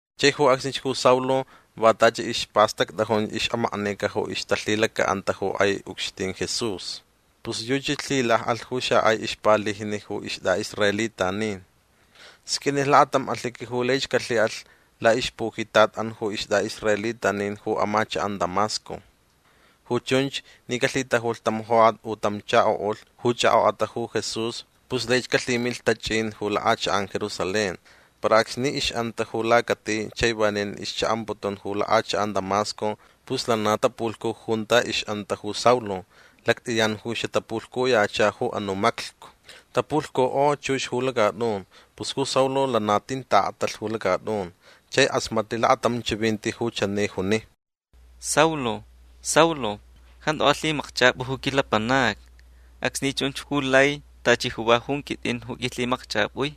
Chai ju acsnich ju Saulo va tachi ispastactʼajun ixʼamaknica ju ixtalhilacaʼanta ju kʼai ucxtin Jesús. Pus yuchi lhilakʼalh ju xakʼai ixpalijni ju istʼaʼisraelitanin. Sqʼuinilh lakatam alhiqui ju laich calhiʼalh laʼixpujitatʼan ju istʼaʼisraelitanin ju amachakʼan Damasco. Ju chunch ni calhitajulh tam jokʼat u tam chakoʼulh ju chʼakʼokʼata ju Jesús pus laich calhimilh tachʼin ju lakʼachakʼan Jerusalén. Para acsni ixʼanta ju lacati chai vanin ixchaʼamputun ju lakʼachakʼan Damasco pus lana mapulhcu junta ixʼanta ju Saulo. Lactʼiyan ju xatapulhcuyacha ju anuʼ maclhcu. Tapulhcukʼo chux ju lacatʼun. Pus ju Saulo lana tin taʼaktalh ju lacatʼun. Chai kʼasmatlh lakatam chivinti ju chani juni: ―Saulo. Saulo. Jantu alhimakchʼapʼu ju quilapanacni. Acsni chun ju lai tachi ju va jun quitʼin ju qʼuilhimakchʼapʼui.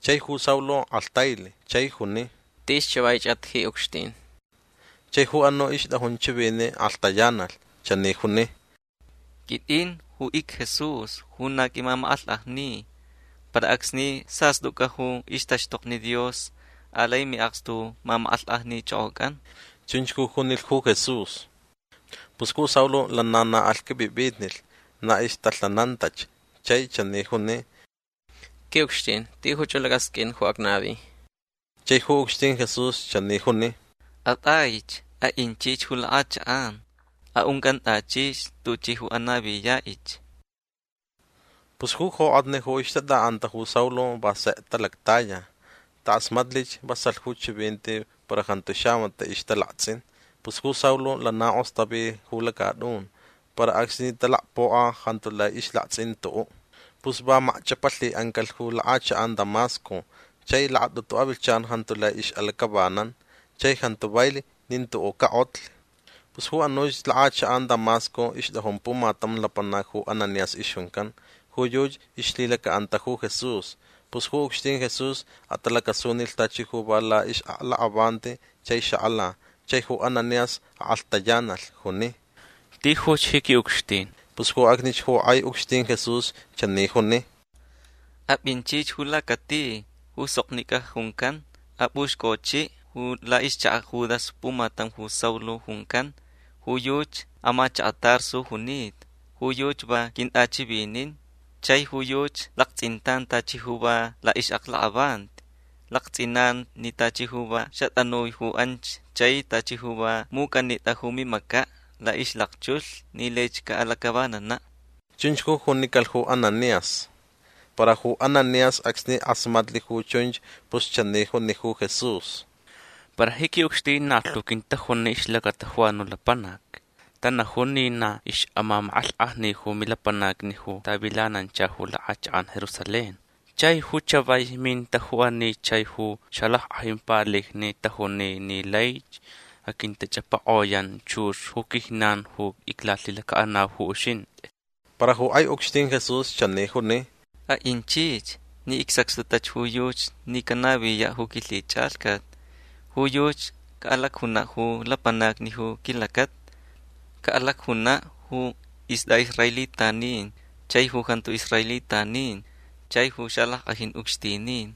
Chai ju Saulo kʼalhtailh. Chai juni: ―Tis chavaichʼat ji ucxtin. Chai ju anuʼ ixtʼajun chiviniʼ kʼalhtayanalh. Chani juni: ―Quitʼin ju icJesús ju na qʼuimamakʼalhkʼajni. Para acsni sastʼucʼa ju ixtaxtokni Dios alai miʼakstu ju mamakʼalhkʼajnichʼokʼocʼan. ―Chunch ju junilh ju Jesús. Pus ju Saulo lana na alhqʼuipʼipʼitnilh. Na ixtalhanantach. Chai chani juni: ―Quiʼucxtin tijuch ju lacʼasqʼuin ju acnavi. Chai ju ucxtin Jesús chani juni: ―Atʼaich. Aʼinchich ju lakʼachakʼan. Aʼuncʼantʼachich tuchʼi ju anaviyaʼich. Pus ju jokʼatni ju ixtatʼaʼanta ju Saulo va sek talactaya. Takʼasmatlich vasalh ju chivinti para jantu xamatiʼ ixtalaktsʼin. Pus ju Saulo lana kʼostavi ju lacatʼun. Para acsni talacpokʼa jantu lai ixlaktsʼin tuʼuʼ. Pus va macchʼapalhiʼancalh ju lakʼachakʼan Damasco. Chai lakatʼutu avilhchan jantu lai ixʼalacʼavanan. Chai jantu vailh nin tuʼuʼ cakʼotlh. Pus ju anuch lakʼachakʼan Damasco ixtʼajun pumatam lapanac ju Ananías ixjuncan. Ju yuchi ixlhilacaʼanta ju Jesús. Pus ju ucxtin Jesús atalacasunilh tachi ju va laʼixʼaklakʼavanti. Chai xakʼala. Chai ju Ananías akʼalhtayanalh. Juni: ―Tijuch ji quiʼucxtin. Pus ju acsnich ju kʼai ucxtin Jesús chani juni: ―Apʼinchich ju lacati ju Soknicʼa juncan. Apʼuxcʼochiʼ laʼixchakaʼ Judas pumatam ju Saulo juncan. Ju yuchi amachakaʼ Tarso junita. Ju yuchi va quintʼachivinin. Chai ju yuchi laktsʼintan tachi ju va laʼixʼaklakʼavanti. Laktsʼinan ni tachi ju va xatʼanui ju anch chai tachi ju va mucʼanitʼa ju mimacaʼ laʼixlakchulh ni laich caʼalacʼavananaʼ. ―Chunch ju junicalh ju Ananías. Para ju Ananías acsni kʼasmatlh ju chunch pus chani juni ju Jesús: ―Para ji quiʼucxtin na lhu quintajuni ixlacata ju anuʼ lapanac. Tanajun ni na ixʼamamakʼalhkʼajni ju milapanacni ju tavilanancha ju lakʼachakʼan Jerusalén. Chai ju chavai minta ju ani chai ju xalackʼajin palijni tajuni ni laich aquintachʼapakʼoyan chux ju quijnan ju iclalhilacaʼanau ju uxintʼi. Para ju kʼai ucxtin Jesús chani juni: ―Aʼinchich ni icsacxtutach ju yuchi ni canaviyaʼ ju quilhichʼalhcat. Ju yuchi caʼalacjunaʼ ju lapanacni ju quilacata. Caʼalacjunaʼ ju istʼaʼisraelitanin chai ju jantu israelitanin chai ju xalackʼajin ucxtinin.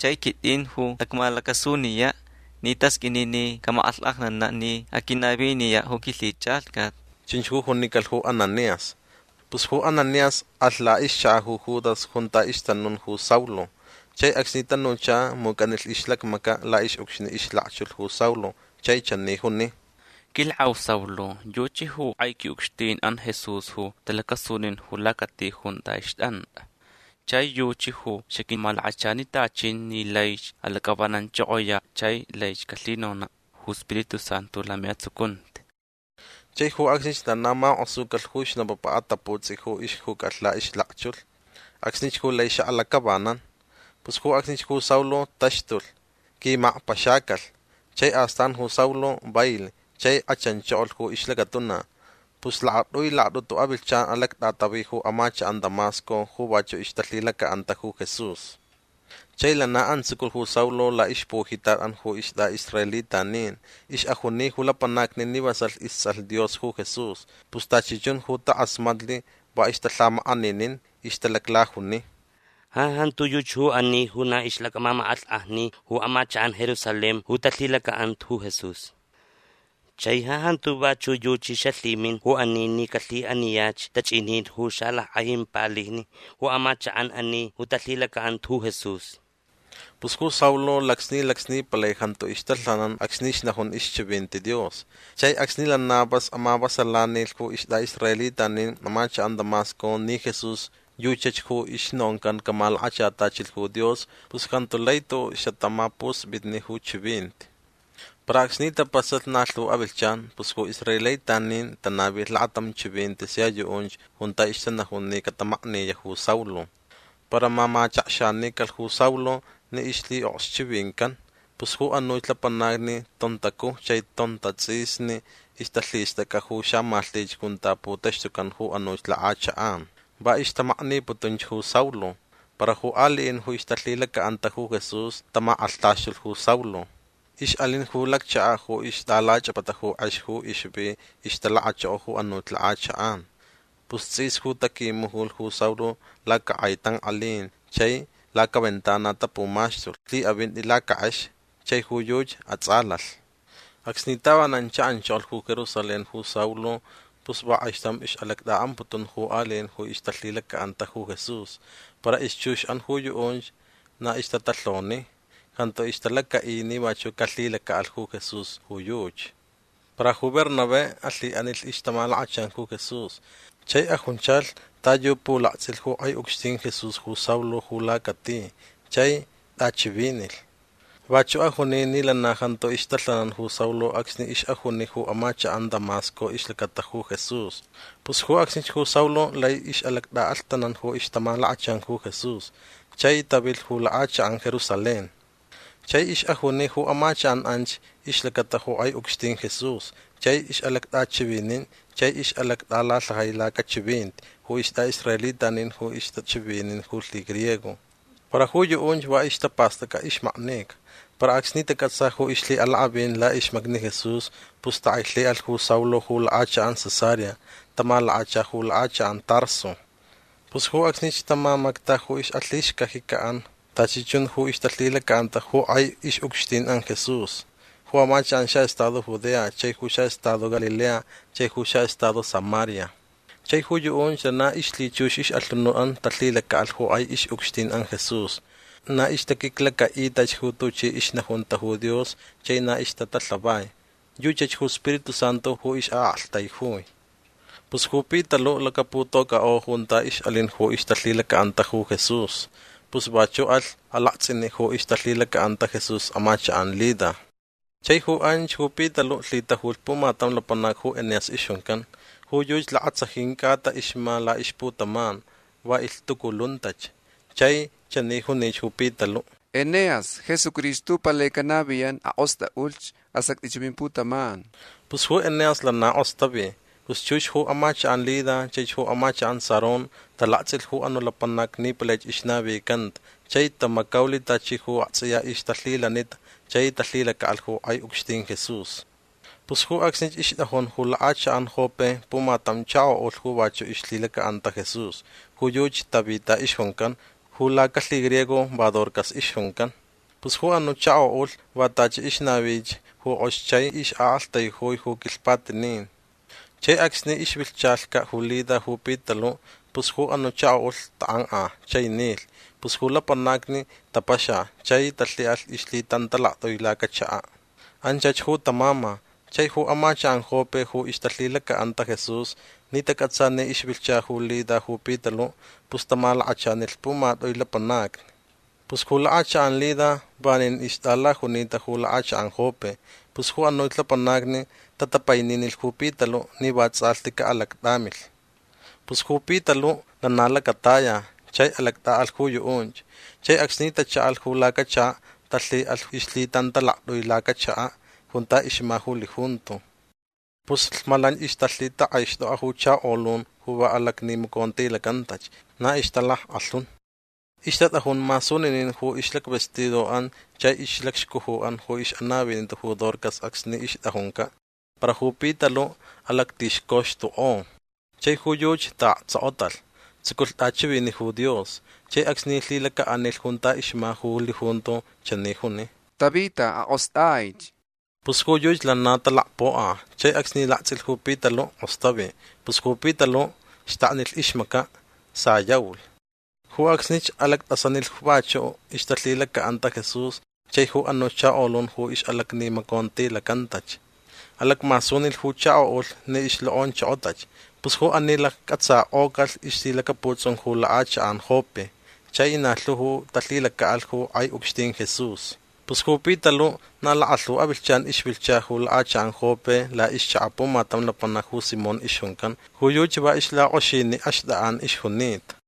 Chai quitʼin ju acmalacasuniyaʼ ni tasqʼuini ni camakʼalhkʼajnanaʼ ni aquinaviniyaʼ ju quilhichʼalhcat. ―Chunch ju junicalh ju Ananías. Pus ju Ananías alh laʼixchakaʼ ju Judas junta ixtanun ju Saulo. Chai acsni tanucha mucʼanilh ixlacmacaʼ laʼixʼucxni ixlakchulh ju Saulo chai chani juni: ―Quilakʼau Saulo yuchi ju kʼai quiʼucxtinʼan Jesús ju talacasunin ju lacati junta ixtʼantʼa. Chai yuchi ju xaquimalakachanitachin ni laich alacʼavananchʼokʼoyaʼ chai laich calhinonaʼ ju Spiritu Santu lamiʼatsucunti. Chai ju acsnich lana makʼosucalh ju snapapa ataputsʼi ju ixjucʼalh laʼixlakchulh. Acsnich ju lai xaʼalacʼavanan. Pus ju acsnich ju Saulo taxtulh. Quimakpaxacalh. Chai astan ju Saulo vailh chai kʼachanchokolh ju ixlacatuna. Pus lakatʼui lakatʼutu avilhchan alactʼatavi ju amachakʼan Damasco ju vachuʼ ixtalhilacaʼanta ju Jesús. Chai lana antsuculh ju Saulo laʼixpujitatʼan ju istʼaʼisraelitanin. Ixʼajuni ju lapanacni ni vasalh istsʼalh Dios ju Jesús. Pus tachi chun ju takʼasmatlh va ixtalhamakʼaninin. Ixtalaclajuni: ―Ja jantu yuchi ju ani ju na ixʼalacmamakʼalhkʼajni ju amachakʼan Jerusalén ju talhilacaʼanta ju Jesús. Chai ja jantu vachuʼ yuchi xalhiminch ju ani ni calhiʼaniyach tachʼinin ju xalackʼajin palijni ju amachakʼan ani ju talhilacaʼanta ju Jesús. Pus ju Saulo lacsni lacsni palai jantu ixtalhanan acsni ixnajun ixchivinti Dios. Chai acsni lana vas amavasalanilh ju istʼaʼisraelitanin amachakʼan Damasco ni Jesús yuchach ju ixnoncan camalakachatachilh ju Dios pus jantu lai tuʼuʼ xatamapuspitni ju chivinti. Para acsni tapasalh na lhu avilhchan pus ju israelitanin tanavilh lakatam chivinti sia yuʼunch junta ixtanajun ni catamakniyaʼ ju Saulo. Para mamachakxanicalh ju Saulo ni ixlhiʼokxchivincan. Pus ju anuch lapanacni tontacuj chai tontatsʼisni ixtalhistʼacʼa ju xamalhtich junta putaxtucan ju anuch lakʼachakʼan. Va ixtamakniputunch ju Saulo. Para ju aliʼin ju ixtalhilacaʼanta ju Jesús tamakʼalhtaxtulh ju Saulo. Ixʼalin ju lacchakaʼ ju ixtʼalachʼapata ju kʼex ju ixvi ixtalakachoko ju anuʼ lakʼachakʼan. Pus tsʼis ju taquimujulh ju Saulo lacakʼai tankʼalin chai lacaventana tapumaxtulh lhiʼavinti lacakʼex. Chai ju yuchi atsʼalalh. Acsni tavanan chaʼanchokolh ju Jerusalén ju Saulo pus va kʼaixtam ixʼalactʼaʼamputun ju aliʼin ju ixtalhilacaʼanta ju Jesús. Para ixchuxʼan ju yuʼunch na ixtatalhoni. Jantu ixtalacaʼi ni vachuʼ calhilacaʼalh ju Jesús ju yuchi. Para ju Bernabé alhiʼanilh ixtamalakachan ju Jesús. Chai ajunchalh ta yu pulaktsʼilh ju kʼai ucxtin Jesús ju Saulo ju lacati chai tʼachivinilh. Vachuʼ ajuni ni lana jantu ixtalhanan ju Saulo acsni ixʼajuni ju amachakʼan Damasco ixlacata ju Jesús. Pus ju acsnich ju Saulo lai ixʼalactʼaʼalhtanan ju ixtamalakachan ju Jesús. Chai tavilh ju lakʼachakʼan Jerusalén. Chai ixʼajuni ju amachakʼan anch ixlacata ju kʼai ucxtin Jesús. Chai ixʼalactʼachivinin chai ixʼalactʼalalhajai lacachivinti ju istʼaʼisraelitanin ju ixtachivinin ju lhigriego. Para ju yuʼunch va ixtapastʼacʼa ixmaknica. Para acsni tacʼatsa ju ixlhiʼalakʼavin laʼixmacni Jesús pus takʼailhiʼalh ju Saulo ju lakʼachakʼan Cesarea. Tamalakacha ju lakʼachakʼan Tarso. Pus ju acsnich tamamacta ju ixʼalhixcajicaʼan tachi chun ju ixtalhilacaʼanta ju kʼai ixʼucxtinʼan Jesús ju amachakʼan ju xaʼestado Judea chai ju xaʼestado Galilea chai ju xaʼestado Samaria. Chai ju yuʼunch lana ixlhichux ixʼalhunutʼan talhilacaʼalh ju kʼai ixʼucxtinʼan Jesús. Na ixtaquiclacaʼitach ju tuchi ixnajunta ju Dios chai na ixtatalhavai. Yuchach ju Spiritu Santu ju ixʼaʼaktaijui. Pus ju Pitaluʼ lacaputocʼakʼo junta ixʼalin ju ixtalhilacaʼanta Jesús. Pus vachuʼ alh alaktsʼiniʼ ju ixtalhilacaʼanta Jesús amachakʼan Lida. Chai ju anch ju Pitaluʼ lhitajulh pumatam lapanac ju Eneas ixjuncan. Ju yuchi lakatsajin cʼata ixma laʼixputaman. Va ilhtuculuntach. Chai chani junich ju Pitaluʼ: ―Eneas Jesucristo ju palai canaviyan. Akʼostʼaʼulh. Asactʼich ju mimputaman. Pus ju Eneas lana kʼostavi. Pus chux ju amachakʼan Lida chaich ju amachakʼan Sarón talaktsʼilh ju anuʼ lapanac ni palaich ixnavicanta chai tamacaulh tachi ju aktsʼiya ixtalhilanita chai talhilacaʼalh ju kʼai ucxtin Jesús. Pus ju acsnich ixtʼajun ju lakʼachakʼan Jope pumatam chakoʼulh ju vachuʼ ixlhilacaʼanta Jesús. Ju yuchi Tabita ixjuncan. Ju lacalhigriego va Dorcas ixjuncan. Pus ju anuʼ chakoʼulh va tachi ixnavich ju kʼox chai ixʼaʼaktaijui ju quilhpatinin. Chai acsni ixvilhchacaʼ ju Lida ju Pitaluʼ pus ju anuʼ chakoʼulh takʼankʼa chai nilh. Pus ju lapanacni tapaxa chai talhiʼalh ixlhitantalaktʼui lacachakaʼ. Anchach ju tamama. Chai ju amachakʼan Jope ju ixtalhilacaʼanta Jesús ni tacʼatsa ni ixvilhcha ju Lida ju Pitaluʼ pus tamalakachanilh pumatʼui lapanacni. Pus ju lakʼachakʼan Lida vanin ixtʼalajunita ju lakʼachakʼan Jope. Pus ju anuch lapanacni tatapaininilh ju Pitaluʼ ni vatsʼalhti caʼalactʼamilh. Pus ju Pitaluʼ lana lacataya chai alactʼaʼalh ju yuʼunch. Chai acsni tachaʼalh ju lacachakaʼ talhiʼalh ixlhitantalaktʼui lacachakaʼ junta ixma ju lijunto. Pus lhmalanch ixtalhitakʼaixtokta ju chakolun ju va alacnimacontilacantach. Na ixtalackʼalhun. Ixtatʼajun masuninin ju ixlacvestidoʼan chai ixlacxcujuʼan ju ixʼanavinita ju Dorcas acsni ixtʼajuncaʼ. Para ju Pitaluʼ alactixcoxtukʼo. Chai ju yuchi taʼaktsokotalh. Tsuculh tʼachiviniʼ ju Dios. Chai acsni lhilacaʼanilh junta ixma ju lijunto chani juni: ―Tabita akʼostʼaich. Pus ju yuchi lana talacpokʼa chai acsni laktsʼilh ju Pitaluʼ kʼostavi. Pus ju Pitaluʼ xtaknilh ixmacaʼ. Sayaulh. Ju acsnich alactʼasanilh ju vachuʼ ixtalhilacaʼanta Jesús chai ju anuch chakolun ju ixʼalacnimacontilacantach. Alacmasunilh ju chakoʼulh ni ixlokʼonchokotach. Pus ju ani laccʼatsakʼocalh ixlhilacaputsʼun ju lakʼachakʼan Jope. Chai na lhu ju talhilacaʼalh ju kʼai ucxtin Jesús. Pus ju Pitaluʼ na lakalhu avilhchan ixvilhcha ju lakʼachakʼan Jope laʼixchakaʼ pumatam lapanac ju Simón ixjuncan. Ju yuchi va ixlakʼoxiniʼ axtʼakʼan ixjunita.